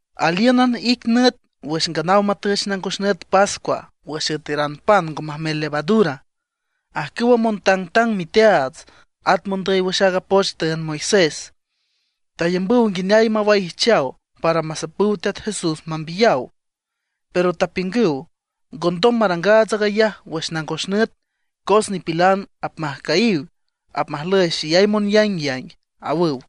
Alíünan ic nüt wüx nganaw matüch nangos nüt pascua wüx üeteran pan ngo majmel levadura. Ajcüwa montangtang miteaats, at mondüy wüx aaga poch tüünd Moisés, tayambüw nguineay mawaijchaw para masapüw Teat Jesús mambiyaw. Pero tapiüngüw: ―Ngondom marangaats aag ayaj wüx nangos nüt, cos nipilan apmajcüyiw, apmajlüy xeyay monyaingyaing ―awüw.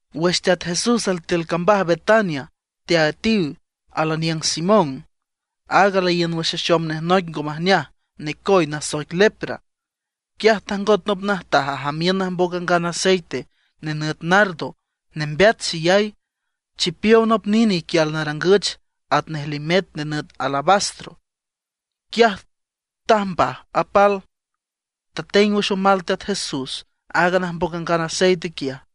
Wüx Teat Jesús altiül cambaj Betania, teaüetiw al aniüng Simón, aag laíün wüx axom nej noic ngo majneaj necoy nasoic lepra. Quiaj tajngot nop najtaj ajamiün najmboc angan aceite, nenüt nardo nembeat xeyay, chipiow nop nine iquial narangüch atnej limet nenüt alabastro. Quiaj tajmbaj apal, tateng wüx omal Teat Jesús aaga najmboc angan aceite quiaj.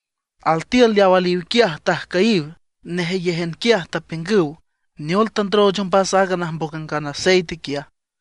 Altiül leaw aliw quiaj tajcüyiw, nejeyéjan quiaj tapiüngüw: ―¿Neol tandrooch ombas aaga najmboc angan aceite quiaja?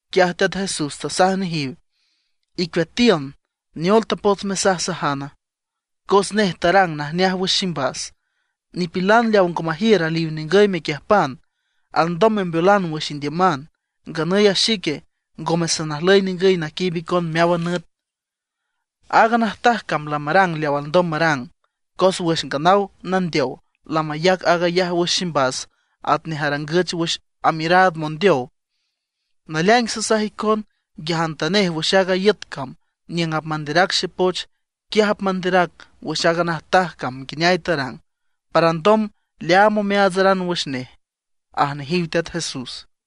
Quiaj Teat Jesús tasaj nejiw: ―Icueatiün, ¿neol tapots mesajsajana? Cos nej tarang najneaj wüx ximbas. Nipilan leaw ngo majiür aliw ningüy mequiüjpan, alndom membeolan wüx indiüman; nganüy a xique ngome sanajlüy ningüy naquiiüb icon meáwan nüt. Aaga najtaj cam lamarang leaw alndom marang; cos wüx nganaw nandeow lamayac aag ayaj wüx ximbas atnej arangüch wüx amiüraad mondeow. Naleaing sasaj icon, nguiajantanej wüx aaga iüt cam niüng apmanderac xepoch, quiaj apmanderac wüx aaga najtaj cam nguineay tarang, para alndom leaam omeaatsaran wüx nej ―aj nejiw Teat Jesús.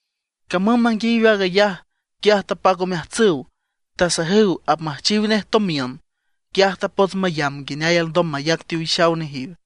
Camüm manguiayiw aag ayaj, quiaj tapac omeajtsüw, tasajüw apmüjchiw nej tomiün. Quiaj tapots mayamb nguineay alndom mayac teowixaw nejiw.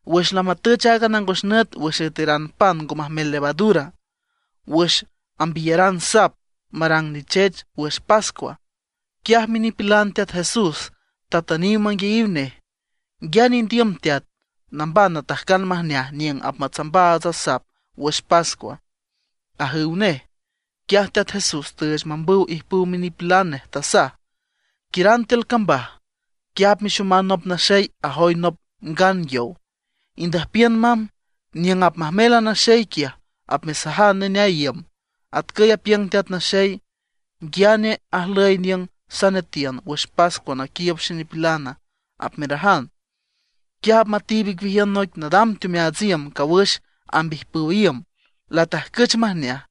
Wüx lamatüch aaga nangos nüt wüx üeteran pan ngo majmel levadura, wüx ambiyaran sap marang nichech wüx pascua, quiaj minipilan Teat Jesús tatüniw manguiayiw nej: ―¿Nguiane indiüm, Teat, namban natajcan majneaj niüng apmatsambaats a sap wüx pascua? ―ajüw nej. Quiaj Teat Jesús tüüch mambüw ijpüw minipilan nej, tasaj: ―Quiüran tiül cambaj. Quiaj apmexoman nop naxey ajoy nop ngan yow, indüjpiün mamb. Niüng apmajmel a naxey, quiaj apmesajan neneay iüm: “Atcüy apiüng Teat Naxey: ¿Nguiane ajlüy niüng sanetiün wüx pascua naquiiüb xenipilana?” apmerajan. Quiaj apmatiib icueajiün noic nadam teomeaats iüm cawüx amb ijpüw iüm, latajcüch majneaj.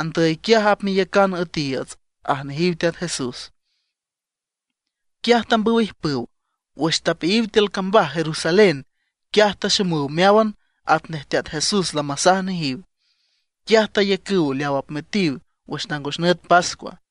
Andüy quiaj apmeyacan üetiiüts ―aj nejiw Teat Jesús. Quiaj tambüw ijpüw. Wüx tapeayiw tiül cambaj Jerusalén, quiaj taxomüw meáwan atnej Teat Jesús lamasaj nejiw. Quiaj tayacüw leawa apmüetiw wüx nangos nüt pascua.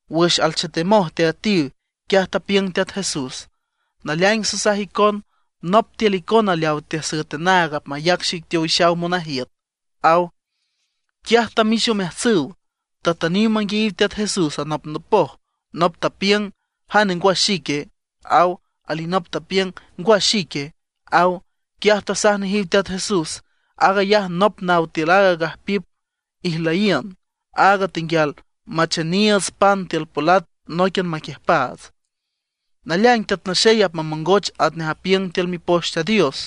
Wüx alchetemoj teaüetiw, quiaj tapiüng Teat Jesús: ―Naleaing sasaj icon, nop tiül icona leawa teasüet anaag apmayac xic teowixaw monajiüt ―aw. Quiaj tamix omeajtsüw, tatüniw manguiayiw Teat Jesús anopnopoj. Nop tapiüng: ―¿Jane, ngwa xique? ―aw. Alinop tapiüng: ―¿Ngwa xique? ―aw. Quiaj tasaj nejiw Teat Jesús: ―Aag ayaj nop naw tiül aaga gajpiüp ijlüyiün, áag tenguial macheniiüts pan tiül polat nóiquian maquiüjpaats. Naleaing Teat Naxey apmamongoch atnej apiüng tiül Mipoch Teat Dios,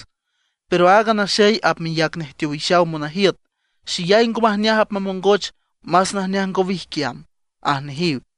¡pero aaga naxey apmeyac nej teowixaw monajiüt xeyay ngo majneaj apmamongoch, más najneaj ngo wijquiam! ―aj nejiw.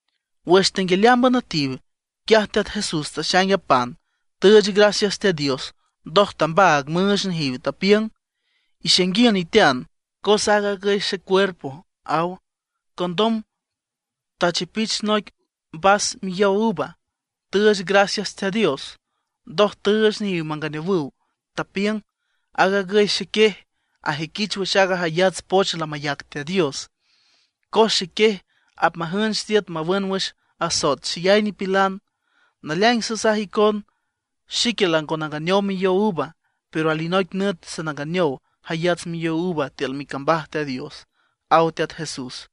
Wüx tenguialeámban üetiw, quiaj Teat Jesús taxaing a pan, tüüch gracias Teat Dios, ndoj tambaag müüch nejiw, tapiüng: ―Ixainguiün itean, cos aag agüy xecuerpo ―aw. Condom tachipich noic vas miyow uva, tüüch gracias Teat Dios. Ndoj tüüch nejiw manganeowüw. Tapiüng: ―Aag agüy xequiej, ajüiquich wüx aaga jayats poch lamayac Teat Dios, cos xequiej apmajünch tiüt mawün wüx asoet xeyay nipilan. Naleaing sasaj icon xique lango nanganeow miyow uva; pero alinoic nüt sananganeow jayats miyow uva tiül micambaj Teat Dios ―aw Teat Jesús.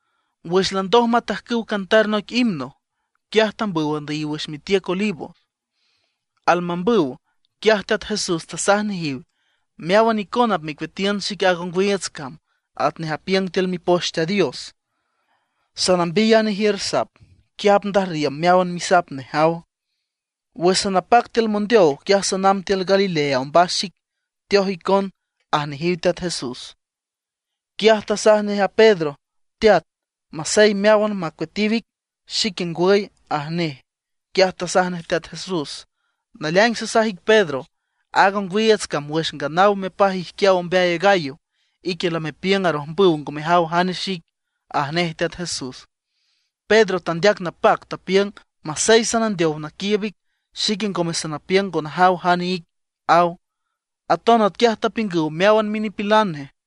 Wüx landoj matajcüw cantar noic himno, quiaj tambüw andüyiw wüx mitiüc Olivos. Almambüw, quiaj Teat Jesús tasaj nejiw: ―Meáwan icona apmecueatiün xic aaga ongwiiüts cam, atnej apiüng tiül Mipoch Teat Dios: “Sanambiy a nejiür sap, quiaj apndajrriüm meáwan misap nej”, aw. Wüx sanapac tiül mondeow, quiaj sanamb tiül Galilea ombas xic, teoj icon ―aj nejiw Teat Jesús. Quiaj tasaj nej a Pedro: ―Teat, masey meáwan macueatiw ic, xique ngwüy ―aj nej. Quiaj tasaj nej Teat Jesús: ―Naleaing sasaj ic Pedro, aaga ongwiiüts cam, wüx nganaw mepaj ijquiaw ombeay a gallo, ique lamepiüng arojmbüw ngo mejaw jane xic ―aj nej Teat Jesús. Pedro tandeac napac, tapiüng: ―Masey sanandeow naquiiüb ic, xique ngome sanapiüng ngo najaw jane ic ―aw. Aton atquiaj tapiüngüw meáwan minipilan nej.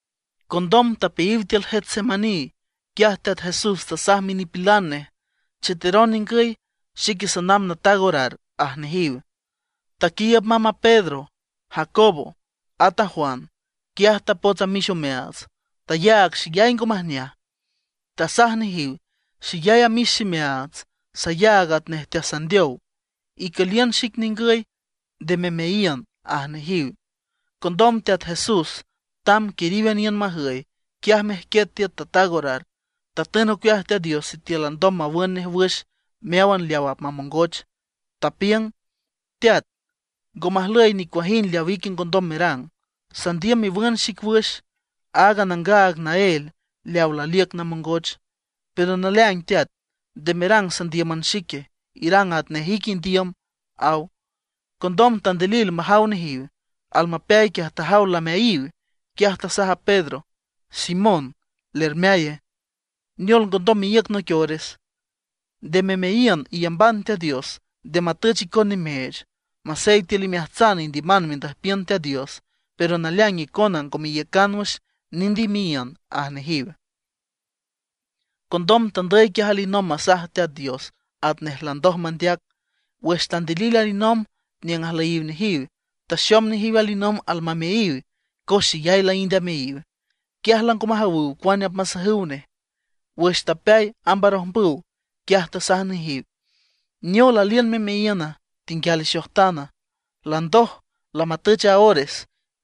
Condom tapeayiw tiül Getsemaní. Quiaj Teat Jesús tasaj minipilan nej: ―Cheteron ningüy; xique sanamb nataag orar ―aj nejiw. Taquiiüb mamb a Pedro, Jacobo, at a Juan. Quiaj tapots amix omeaats, tayaag xeyay ngo majneaj. Tasaj nejiw: ―Xeyay amix ximeaats, sayaag atnej teasandeow. Icüliün xic ningüy, nde memeayiün ―aj nejiw. Condom Teat Jesús tamb quiríwan iün majüy, quiaj mejquiet tiüt ataag orar. Tatün ocueaj Teat Dios sitiül alndom mawün nej wüx meáwan leawa apmamongoch. Tapiüng: ―Teat, ngo majlüy nicuajind leawa ique ngondom merang. Sandiüm mewün xic wüx aaga nangaag naél leawa laliüc namongoch. Pero naleaing Teat, nde merang sandíüman xique, irang atnej ique indiüm ―aw. Condom tandilil majaw nejiw. Almapeay quiaj tajaw lameayiw. Quiaj tasaj a Pedro: ―Simón, ¿lermeaya? ¿Neol ngondom meíüc noic ores? Nde memeayiün, iyamban Teat Dios, nde matüch icon nimeech. Masey tiül imeajtsan indiüman mendüjpiün Teat Dios, pero naleaing icona ngo meiücan wüx, nind imeayiün ―aj nejiw. Condom tandüy quiaj alinomb masaj Teat Dios atnej landoj mandeac. Wüx tandilil alinomb niüng ajlüyiw nejiw, taxom nejiw alinomb almameayiw, cos xeyay laínd ameayiw. Quiaj lango majawüw cuane apmasajüw nej. Wüx tapeay amb arojmbüw, quiaj tasaj nejiw: ―¿Neol aliün memeayiüna, tenguial ixojtana? Landoj, lamatüch a ores.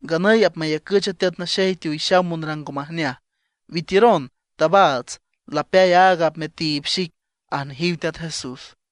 Nganüy apmayacüch a Teat Naxey teowixaw monrang ngo majneaj. Witiüron, tabaats, lapeay aaga apmetiib xic ―aj nejiw Teat Jesús.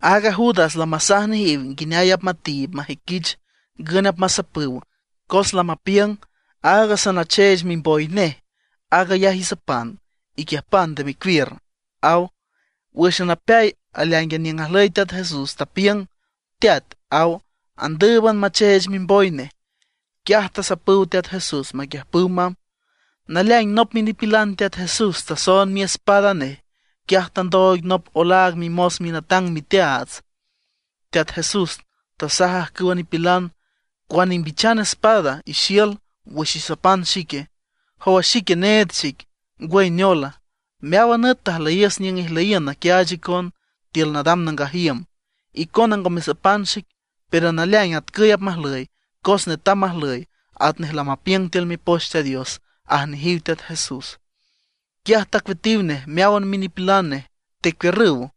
Aaga Judas lamasaj nejiw nguineay apmatiib majüiquich ngün apmasapüw, cos lamapiüng: ―Áag sanacheech mimboy nej, aag ayaj isapan, iquiüjpan nde mecuiür ―aw. Wǘxan apeay aleáingan niüng ajlüy Teat Jesús, tapiüng: ―Teat ―aw. Andǘüban macheech mimboy nej. Quiaj tasapüw Teat Jesús, taquiüjpüw mamb. Naleaing nop minipilan Teat Jesús tasoond miespada nej, quiaj tandooig nop olaag mimos minatang miteaats. Teat Jesús tasaj ajcüwa nipilan: ―¿Cuane ijmbichan espadas y xiül wüx isapan xique? ¿Jowa xique, need xic, ngwüy neola? Meáwan nüt tajlüyiüs niüng ijluyiün naquiaach icon tiül nadam nangaj iüm, icona ngo mesapan xic. Pero naleaing atcüy apmajlüy, cos netam majlüy atnej lamapiüng tiül Mipoch Teat Dios ―aj nejiw Teat Jesús. Quiaj tacueatiw nej meáwan minipilan nej, tecuiürrüw.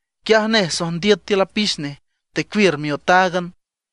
Quiaj nej sojndiüt tiül apix nej, tecuiür miotáagan.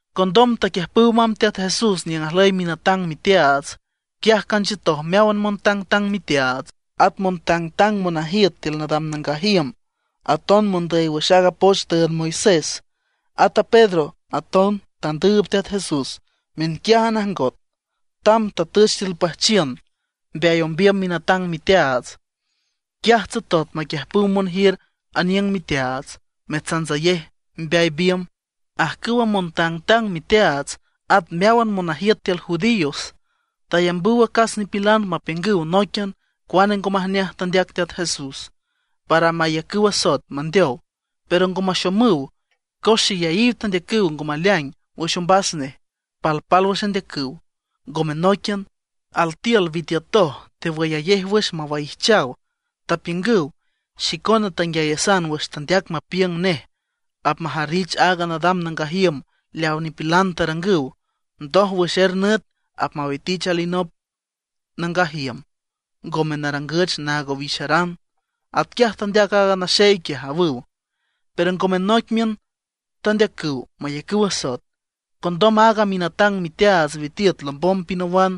Condom taquiüjpüw mamb Teat Jesús niüng ajlüy minatang miteaats. Quiaj canchiütoj meáwan montangtang miteaats, at montangtang monajiüt tiül nadam nangaj iüm, aton mondüy wüx aaga poch tüünd Moisés. Ata Pedro aton tandüüb Teat Jesús miünquiájan ajngot. Tamb tatüch tiül püjchiün mbeay ombiüm minatang miteaats. Quiaj tsotot maquiüjpüw monjiür aniüng miteaats, metsantsayej mbeay biümb. Ajcüwa montangtang miteaats at meáwan monajiüt tiül judíos tayambüw acas nipilan mapiüngüw nóiquian cuane ngo majneaj tandeac Teat Jesús, para mayacüw asoet mandeow, pero ngo maxomüw. Cos xeyayiw tandeacüw ngo maleaing wüx ombas nej, palpálwüx andeacüw, ngome nóiquian. Altiül witiütoj tewüyayej wüx mawaijchaw, tapiüngüw: ―Xicona tanguiayasan wüx tandeac mapiüng nej apmajarrich aaga nadam nangaj iüm leaw nipilan tarangüw, ndoj wüx er nüt apmawitich alinop nangaj iüm, ngome narangüch naag owixaran. Atquiaj tandeac aaga naxey quiaj ―awüw. Pero ngome nóiquian tandeacüw mayacüw asoet. Condom aaga minatang miteaats witiüt lombom pinawan,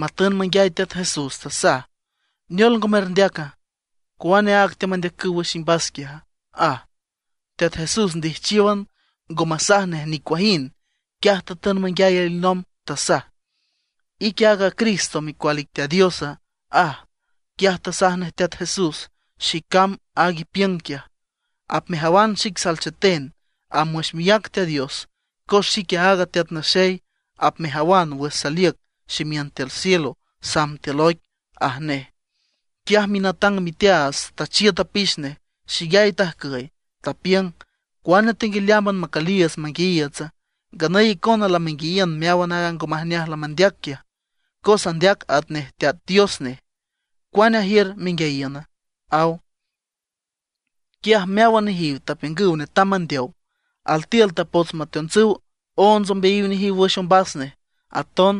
matün manguiay Teat Jesús. Tasaj: ―¿Neol ngo merndeaca? ¿Cuane aag teamandeacüw wüx imbas quiaja? ―aj. Teat Jesús ndijchiówan, ngo masaj nej nicuajind. Quiaj tatün manguiay alinomb, tasaj: ―¿Ique aaga Cristo, micual ic Teat Diosa? ―aj. Quiaj tasaj nej Teat Jesús: ―Xícam aag ipiüng quiaj. Apmejawan xic salcheten amb wüx miác Teat Dios. Cos xique aaga Teat Naxey, apmejawan wüx saliüc ximiün tiül cielo samb tiül oic ―aj nej. Quiaj minatang miteaats tachiüt apix nej, xeyay tajcüy, tapiüng: ―¿Cuane tenguialeámban macüliiüts manguiayiiütsa? Nganüy icona lamenguiayiün meáwan aaga ngo majneaj lamandeac quiaj, cos andeac atnej Teat Dios nej. ¿Cuane ajiür menguiayiüna? ―aw. Quiaj meáwan nejiw tapiüngüw netam mandeow. Altiül tapots mateontsüw onts ombeayiw nejiw wüx ombas nej. Aton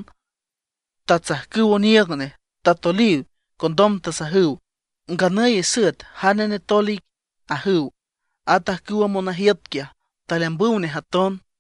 tatsajcüw oniiüg nej, tatoliw. Condom tasajüw: ―¡Nganüy isüet jane netol ic! ―ajüw. At ajcüwa monajiüt quiaj taleambüw nej aton.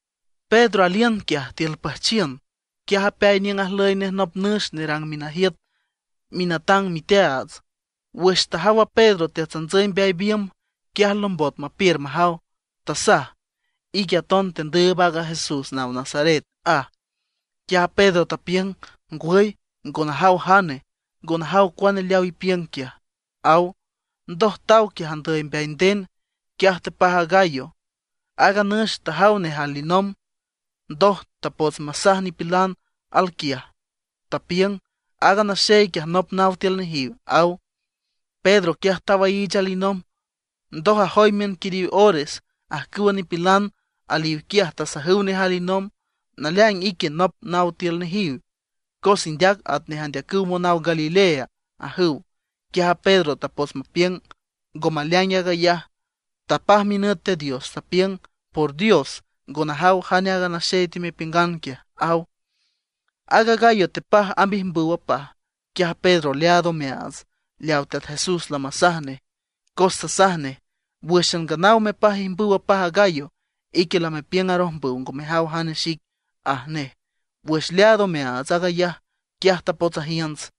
Pedro aliün quiaj tiül püjchiün, quiaj apeay niüng ajlüy nej nop nüx nerang minajiüt minatang miteaats. Wüx tajaw a Pedro teatsantsüy mbeay biümb, quiaj lombot mapiür majaw, tasaj: ―Ique aton tequiiüb aaga Jesús naw Nazaret ―aj. Quiaj a Pedro tapiüng: ―Ngwüy, ngo najaw jane, ngo najaw cuane leaw ipiüng quiaj ―aw. Ndoj taw quiaj andüy mbeay nden, quiaj tepaj a gallo. Aaga nüx tajaw nej alinomb. Ndoj tapots masaj nipilan alquiaj, tapiüng: ―Aaga naxey quiaj nop naw tiül nejiw ―aw. Pedro quiaj tawaiich alinomb. Ndoj ajoy miün quiriw ores, ajcüwa nipilan aliw quiaj tasajüw nej alinomb: ―Naleaing ique nop naw tiül nejiw, cos indeac atnej andeacüw monaw Galilea ―ajüw. Quiaj a Pedro tapots mapiüng ngo maleaing aag ayaj, tapaj minüt Teat Dios, tapiüng: ―¡Por dios, ngo najaw jane aaga naxey temepiüngan quiaj! ―aw. Aaga gallo tepaj amb ijmbüw apaj. Quiaj a Pedro leaad omeaats leaw Teat Jesús lamasaj nej. Cos tasaj nej: “Wǘxan nganaw mepaj ijmbüw apaj a gallo, ique lamepiüng arojmbüw ngo mejaw jane xic”, aj nej. Wüx leaad omeaats aag ayaj, quiaj tapots ajiünts.